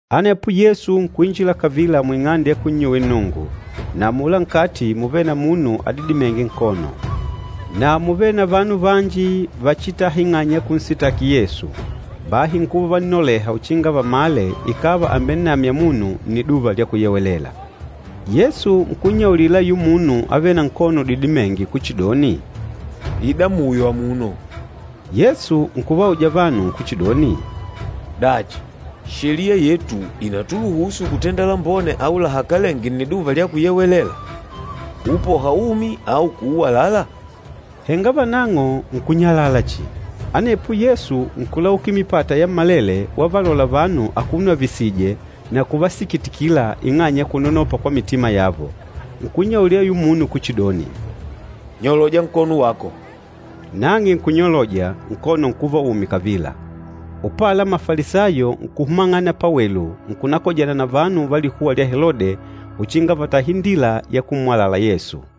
Anepo Yesu nkuinjila kavila muing'ande ya kunnyuwila Nnungu, na amula nkati múvele na munu adidimênge nkono. Na múvele na vanu vanji vachitâha ing'anya ya kunsitaki Yesu, bahi nkuva uvannoleha uchinga vamale ikàva àmbennamya munu Nniduva lya Kuyewelela. Yesu nkunnyaulila ayula munu avêle na nkono adidimênge kuchidoni, “Ida muyo amuno.” Yesu nkuvauja vanu kuchidoni, “Dachi, Sheliya yetu ìnatuluhusu kutenda lambone au lahakalenge Nniduva lya Kuyewelela? Kuupoha umi au kuuwalala?” Henga vanang'o nkunyalala chihi. Anepo Yesu nkulaukila mipata yammalele wavalola vanu akuno avisìjè na kuvasikitikila ing'anya ya kunanopa kwa mitima yavo. Nkunyaulila ayula munu kuchidoni, “Nyoloja nkono wako!” Nang'e nkunyoloja, nkono nkuva umi kavila. Upala, Mafalisayo nkuhumang'ana pawelu nkunakojana na vanu va likuwa lya Helode uchinga vatahe indila ya kummwalala Yesu.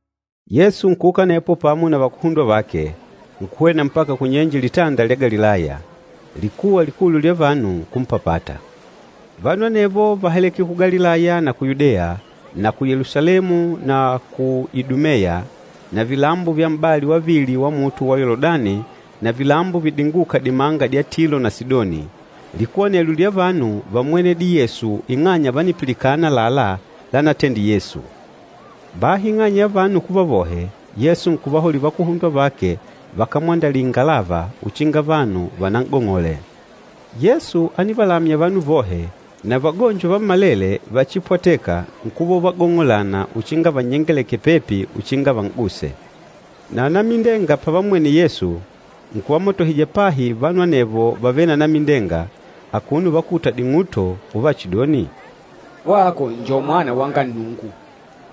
Yesu nkuuka anepo pamo na vakuhundwa vake, nkuhwena mpaka kunyenje Litanda lya Galilaya. Likuwa likulu lya vanu nkumpapata. Vanu anevo váhaleke ku Galilaya na ku Yudeya, na ku Yelusalemu na ku Idumeya na vilambo vya m'bali wavili wa luhunde lwa Yoludani na vilambo vidingûka dimanga dya Tilo na Sidoni. Likuwa anelyo lya vanu vámmwenedile Yesu ing'anya vánipilikana àlalá lanatendile Yesu. Bahi ing'anya ya vanu kuva vohe, Yesu nkuvahaulila vakuhundwa vake vakamwandalile ingalava, uchinga vanu vanan'gong'ole. Yesu ánivalamya vanu vohe, na vagonjo vammalele vachipwateka nkuva uvagong'olana uchinga vannyengelekele pepi uchinga van'guse. Na anamindenga pavammwene Yesu, nkuvamatohija pahi vanu anevo vavêle na anamindenga akuno uvakuta ding'uto uvachidoni, “Wako njo Mwana wanga Nnungu!”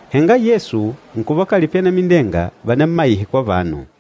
Henga Yesu nkuvakalipila anamindenga vanammaihe kwa vanu.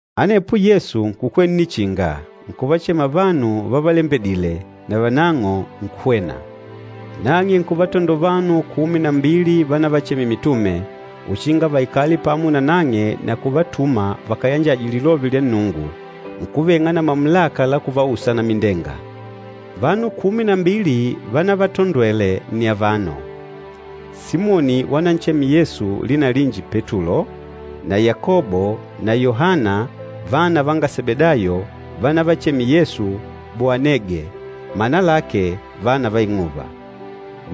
Anepo Yesu nkukwela nnichinga, nkuvachema vanu vavalembedîle, na vanang'o nkuhwena. Nang'e nkuvatandola vanu kumi na mbili vanavachemile mitume, uchinga vaikale pamo nanang'e na kuvatuma vakayanjaje lilove lya Nnungu, nkuveng'a na mamulaka la kuvausa anamindenga. Vanu kumi na mbili vanavatondwele nni avano, Simoni wananchemile Yesu lina linji Petulo, na Yakobo na Yohana vana vanga Sebedayo wanavachemile Yesu, Boanege, mana lake, “Vana va ing'uva,”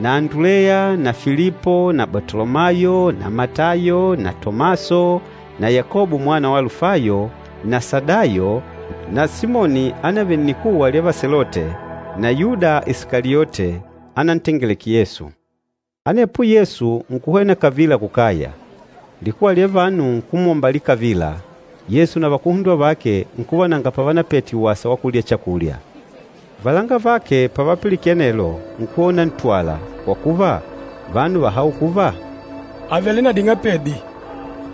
na Anduleya na Filipo na Batolomayo na Matayo na Tomaso na Yakobo mwana wa Alufayo, na Sadayo na Simoni ánavele nnikuwa lya Vaselote, na Yuda Isikaliote, ánantengeleke Yesu. Anepo Yesu nkuhwena kavila kukaya. Likuwa lya vanu nkumwombalila kavila, Yesu na vakuhundwa vake nkuva nanga pavanapete wasa wa kulya chakulya. Valangavake pavapilikene anelo, nkuhwena unantwala, kwa kuva, vanu váhaula kuva, “Àvele na ding'apedi.”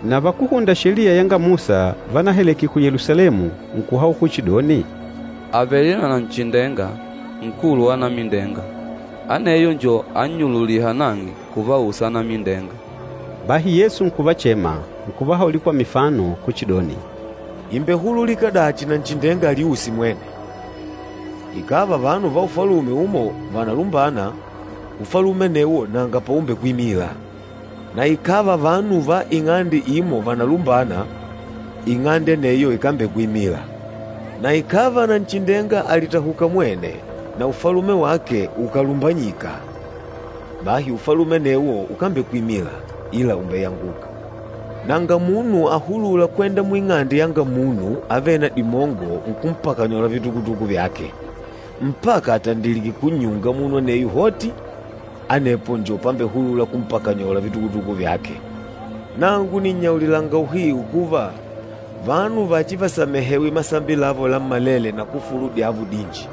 Na vakúhunda Sheliya yanga Musa vanaheleke ku Yelusalemu, nkuhaula kuchidoni, “Àvele na Nanchindenga, nkulu wa anamindenga. Aneyo njo annyululîha nang'e kuvausa anamindenga.” Bahi Yesu nkuvachema, nkuvahaulila kwa mifano kuchidoni, “Ìmbehululika dachi Nanchindenga aliuse mwene? Ikàva vanu va ufalume umo vànalumbana, ufalume anewo nanga paumbekwimila. Na ikàva vanu va ing'ande imo vànalumbana, ing'ande aneyo ikambekwimila. Na ikàva Nanchindenga àlitahuka mwene, na ufalume wake ukàlumbanyika, bahi ufalume anewo ukambekwimila, ila ùmbeyanguka. Nanga munu ahulûla kwenda muing'ande yanga munu avêle na dimongo nkumpakanyola vitukutuku vyake, mpaka atandilike kunnyunga munu aneyo hoti, anepo njo pambehulula kumpakanyola vitukutuku vyake. Nangu nìnnyaulilanga uhiu kuva, vanu vachivasamehewe masambi lavo lammalele na kufulu dyavo dinji.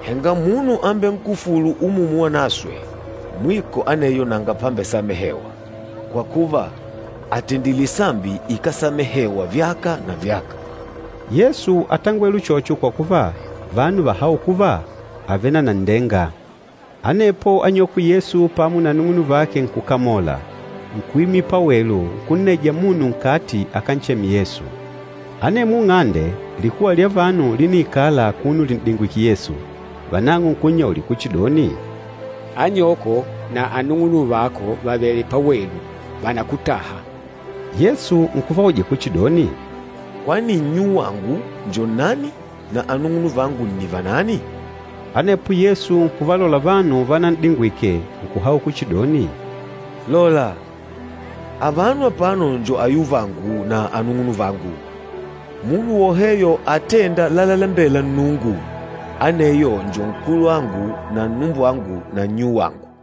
Henga munu ambenkufûlu Umumu Wanaswe, mwiko aneyo nanga pambesamehewa, kwa kuva, àtendile sambi ikásamehewa vyaka na vyaka.” Yesu átangwele uchocho kwa kuva, vanu váhaula kuva, “Àvele na nanndenga.” Anepo anyokwe Yesu pamo na anung'unuvake nkukamola. Nkuimila pawelu, nkunnaija munu nkati akancheme Yesu. Anemwo nng'ande, likuwa lya vanu líniikala akuno lin'dingwìkè Yesu. Vanang'o nkunnyaulila kuchidoni, “Anyoko na anung'unuvako vàvele pawelu, vànakutaha.” Yesu nkuvauja kuchidoni, “Kwani nnyuwangu njo nnani na anung'unuvangu nni vanani?” Anepo Yesu nkuvalola vanu vanan'digwike nkuhaula kuchidoni, “Lola! Avano apano njo ayuvangu na anung'unuvangu. Munu woheyo atênda lalalembela Nnungu, aneyo njo nkulwangu na nnumbwangu na nnyuwangu.”